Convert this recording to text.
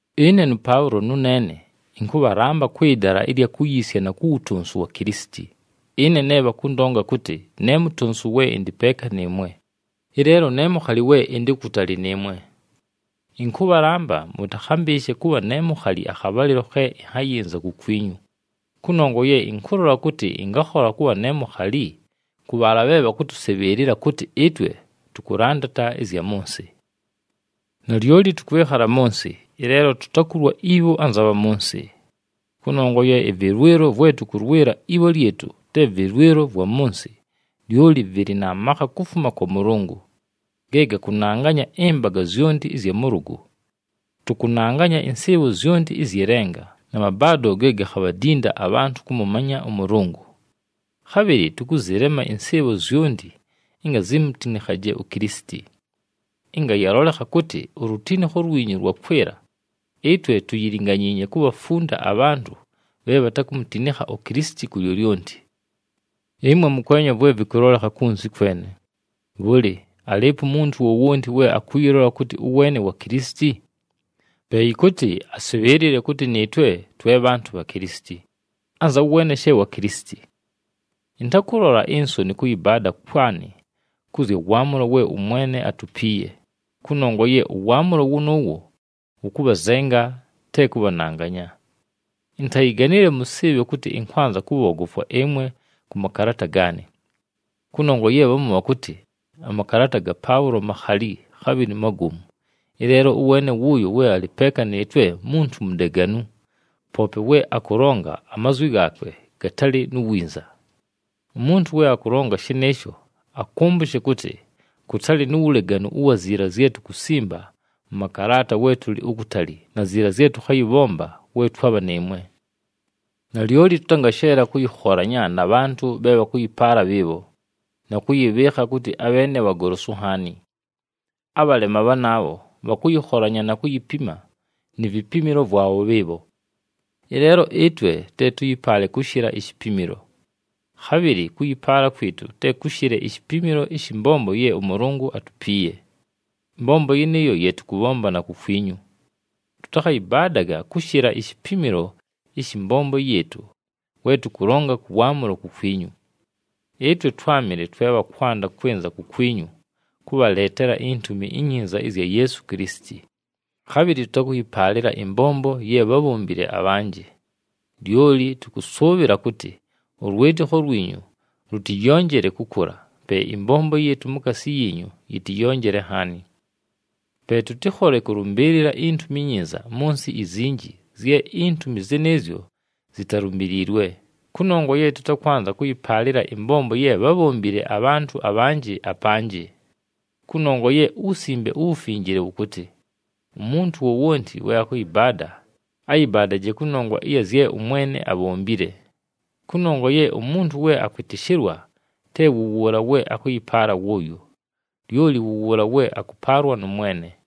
Ɨne nʉPaʉlo nʉneene ɨnkʉbhalamba kwɨ dala ɨlya kuyiisya na ku wutonsu wa Kilisiti, ɨne ne bhakʉndonga kʉtɨ ne mutonsu we ɨndɨ peeka nɨɨmwe, ɨleelo ne mukhali we ɨndɨ ukutali nɨɨmwe. Ɨnkʉbhalamba mʉtakhambɨɨshe kʉbha ne mukhali akhabhalɨlo khe ɨnhayɨnza kukwinyu, kʉnongwa ye ɨnkʉlola kʉtɨ ɨngakhola kʉbha ne mukhali kʉ bhaala bhe bhakʉtʉsɨbhɨɨlɨla kʉtɨ ɨtwe tʉkʉlandata ɨzya mʉ nsɨ. Nalyoli tʉkwɨkhala mʉ nsɨ, ɨleelo tutakulwa ibho anza bha mʉ nsɨ. Kʉnongwa ye ɨvɨlwɨlo vwe tʉkʉlwɨla ibho lyɨtʉ te vɨlwɨlo vwa mʉ nsɨ, lyoli vɨlɨ na makha kufuma kwa Mʉlʉngʉ, ge gakʉnanganya ɨmbaga zyonti ɨzya mʉlʉgʉ. Tʉkʉnanganya ɨnsɨɨbho zyonti ɨzyɨ lenga na mabaado ge gakhabhadinda abhantʉ kʉmʉmanya ʉMʉlʉngʉ. Khabhɨlɨ tʉkʉzɨlema ɨnsɨɨbho zyonti ɨnga zimutinikhaje uKilisiti. Ɨnga yalolekha kʉtɨ ulutinikho lwinyu lwakwɨla, ɨtwe tuyilinganyiinye kubhafunda abhantʉ bhe bhatakumutinikha uKilisiti ku lyolyonti. Ɨmwe mʉkwenya vwe vɨkʉlolekha kunzi kwene. Bhʉlɨ, alɨɨpo umuntu wowonti we akʉyɨlola kʉtɨ ʉweene wa Kilisiti? Pe yɨkʉtɨ asɨbhɨɨlɨle kʉtɨ nɨɨtwe twe bhantʉ bha Kilisiti, anza weene she wa Kilisiti. Ɨntakʉlola insoni kʉyɨbaada kwanɨ kʉ zya waamʉlo we ʉMwene atupiiye, kʉnongwa ye ʉwaamʉlo wʉnʉʉwo wʉkʉbhazenga, te kʉbhananganya. Intayiganile mʉsɨɨbhe kʉtɨ ɨnkwanza kʉbhoogofwa ɨmwe kʉ makalaata gaanɨ. Kʉnongwa ye bhamu bhakʉtɨ, “Amakalaata ga Paʉlo makhali, khabhɨlɨ magomu, ɨleelo ʉweene wʉʉyo we alɨ peeka nɨɨtwe muntu mudeganu, poope we akʉlonga amazwi gaakwe gatalɨ nu winza.” Umuntu we akʉlonga shɨnɨɨsho akʉmbʉshe kʉtɨ, kʉtalɨ nu wuleganu ʉwa ziila zye tukusimba mʉ makalaata we tʉlɨ ukutali, na ziila zye tʉkhayɨbhomba we twabha nɨɨmwe. Nalyoli tʉtangasheela kʉyɨkholanya na bhantʉ bhe bhakʉyɨpaala bhɨɨbho, na kʉyɨbhɨɨkha kʉtɨ abheene bhagolosu nhaani. Abhalema bhanaabho bhakʉyɨkholanya na kuyipima ni vipimilo vwabho bhɨɨbho. Ɨleelo ɨtwe te tʉyɨpaale kʉshɨla ishipimilo. Khabhɨlɨ kʉyɨpaala kwɨtʉ te kʉshɨle ishipimilo ɨshɨ mbombo ye ʉMʉlʉngʉ atupiiye. Ɨmbombo yɨnɨɨyo ye tʉkʉbhomba na kukwinyu. Tʉtakhayɨbaadaga kʉshɨla ishipimilo ɨshɨ mbombo yɨɨtʉ we tʉkʉlonga kʉ waamʉlo kukwinyu. Ɨtwe twámɨle twe bha kwanda kwɨnza kukwinyu kʉbhaleetela iNtumi iNyinza ɨzya Yeesu Kilisiti. Khabhɨlɨ tʉtakʉyɨpaalɨla ɨmbombo ye bhábhombile abhanjɨ. Lyoli tʉkʉsʉʉbhɨla kʉtɨ ʉlwɨtɨkho lwinyu lʉtɨyonjele kʉkʉla, pe ɨmbombo yɨɨtʉ mukaasi yiinyu yɨtɨyonjele nhaani. Pe tʉtɨkhole kʉlʉmbɨɨlɨla iNtumi iNyinza mʉ nsɨ izinji zye intumi zɨnɨɨzyo zitalumbiliilwe, kʉnongwa ye tʉtakwanza kʉyɨpaalɨla ɨmbombo ye bhábhombile abhantʉ abhanjɨ, apanjɨ. Kʉnongwa ye uWusimbe uWufinjile wʉkʉtɨ, “Umuntu wowonti we akʉyɨbaada, ayɨbaadaje kʉnongwa ɨya zye ʉMwene abhombile.” Kʉnongwa ye umuntu we akwɨtɨshɨlwa te wʉ wʉʉla we akʉyɨpaala wʉʉyo, lyoli wʉ wʉʉla we akʉpaalwa nʉ Mwene.